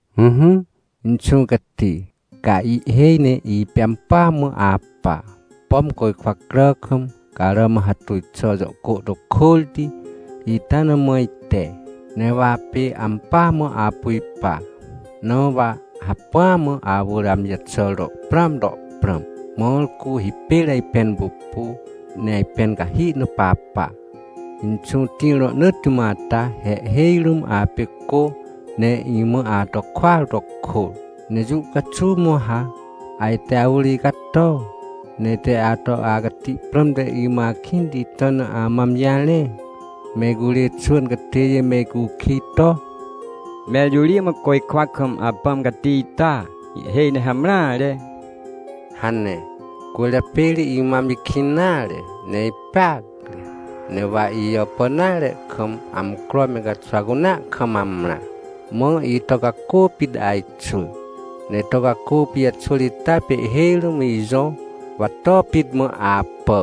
Ỹhỹ, Inxũ Cati, ca ihhêj ne ipê ampỳa mã apa. Pom côjkwa crà kam, carà mã hatuj xà jõ cô to kôrti, ita na mã ite, ne wa apê ampỳa mã apu ipa. Na wa hacpỹa mã awỳr amji jaxàr to prãam to prãm, mãr cu hipêr ajpẽn pupu, ne ajpẽn cahi na papa. Inxũ tĩr rohnỳtti mã ata, he ihhêj rũm apê cô, ne imã ato kôar to kôr. Ne jũ caxuw mã wa ha ajte awỳr icato, ne ite ato acati prãmte imã akĩnti ita na amã amji jarẽ? Me icurê xwỳn catêjê me icukij to: “Mẽr jõ ri mã côjkwa kam Apãm Cati ita? Ihhêj ne hamreare” hane. Cwỳrjapê ri imã amji kĩn nare, ne ipeacre, ne wa ijàpàn nare kam, amcro me caxwa cunea kam amrã. Mã ito cacô pit ajxwỳ. Ne ito cacô pijaxwỳr ita pê ihhêj rũm ijõ, wa to pit mã apà.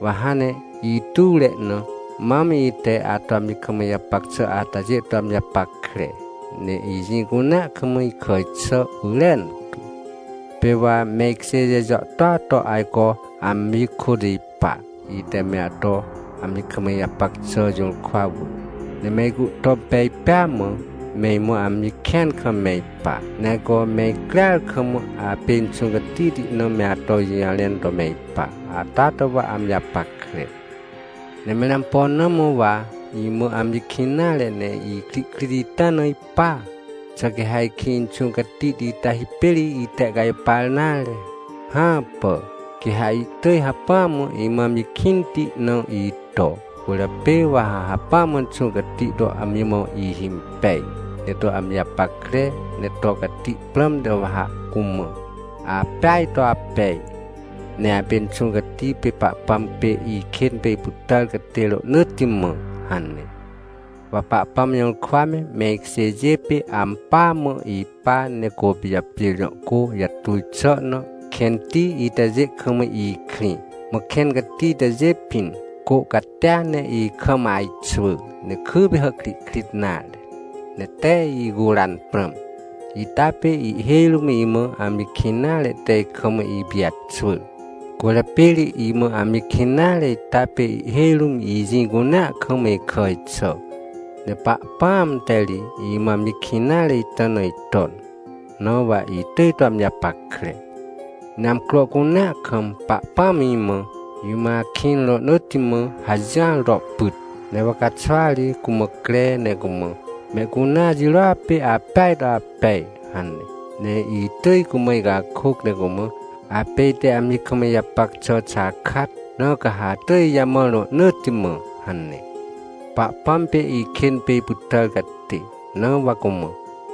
Wa hãn ne ituwre na mam ite ato amji kam ijapac xà atajê to amji japackre, ne ijĩ cunea kam ikàj xà pyrentu. Pê wa me ikjêjê jàhtôa to ajco amji kôt ipa, ite me ato amji kam ijapac xà jũrkwa wỳr. Ne me icuhtom pej pêa mã, me imã amji kĩan kam me ipa, ne ajco me icrear kam apê Inxũ Catihti na me ato ijũjarẽn to me ipa. Ata to wa amji japackre. Ne mẽr ampo na mã wa imã amji kĩn nare ne ikrihkrit ita na ipa? Xà quê ha ajkĩ Inxũ Catihti ita hipêr itehcajpar nare? Hãpà! Quê ha ihtỳj hacpỹa mã imã amji kĩnti na ito. Cwỳrjapê wa ha hacpỹa mã Inxũ Cati to amji mã ihhimpej, ne to amji japackre, ne to cati prãmte wa ha cumã: “Apeaj to apej, ne apê Inxũ Cati pê Pahpãm pê ikên pê ipytàr catê rohnỳtti mã” hane. Wa Pahpãm jũrkwa me, me ikjêjê pê, ampỳa mã ipa, ne Côpijapjêr jõ cô jatuj xà na kẽnti itajê kam ikrĩ. Mã kẽn cati itajê pĩn, cô catia ne ikam ajxwỳ, ne kypê hàhkrihkrit nare, ne tee icuran prãm. Ita pê ihhêj rũm imã amji kĩn nare te ikam ipijaxwỳr. Cwỳrjapê ri imã amji kĩn nare ita pê ihhêj rũm ijĩ cunea kam ikàj xà, ne Pahpãam te ri imã amji kĩn nare ita na iton, na wa itỳj to amji japackre. Ne amcro cunea kam Pahpãm imã: “Imã akĩn rohnỳtti mã” hajỹar to pyt. Ne wa caxwa ri cumã cre, ne cumã: “Mehcunea jirôa pê apeaj to apej” hane. Ne itỳj cumã icakôc ne cumã: “Apê ite amji kam ijapac xà xakat, na ca ha atỳj ijamãr rohnỳtti mã” hane. Pahpãm pê ikên pê ipytàr catê, na wa cumã: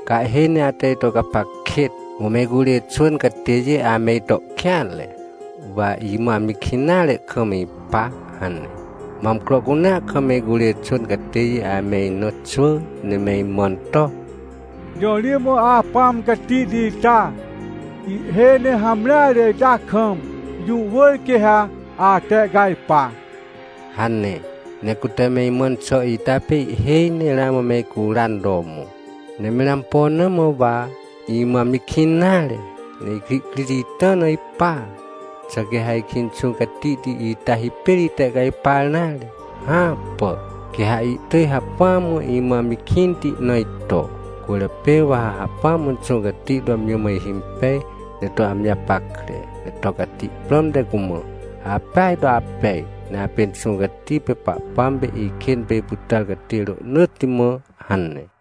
“Ca ihhêj ne ate ito gapac kêt! Mã me icurê xwỳn catêjê ame ito kêanre, wa imã amji kĩn nare kam ipa” hane. Mã amcro cunea kam me icurê xwỳn catêjê ame ina xwỳ, ne me imãn to: “Jõ ri mã Apãm Catihti ita? Ihhêj ne hamreare ita kam, jũ wỳr quê ha atehcajpa” hane. Ne cute me imãn xà ita pê ihhêj ne ramã me icuran to mõ. Ne mẽr ampo na mã wa imã amji kĩn nare, ne ikrihkrit ita na ipa? Xà quê ha ajkĩ Inxũ Catihti ita hipêr itehcajpar nare? Hãpà! Quê ha ihtỳj hacpỹa mã imã amji kĩnti na ito. Cwỳrjapê wa ha hacpỹa mã Inxũ Cati to amji mã ihhimpej, ne to amji japackre, ne to cati prãmte cumã: “Apeaj to apej, ne apê Inxũ Cati pê Pahpãm pê ikên pê ipytàr catê rohnỳtti mã” hane.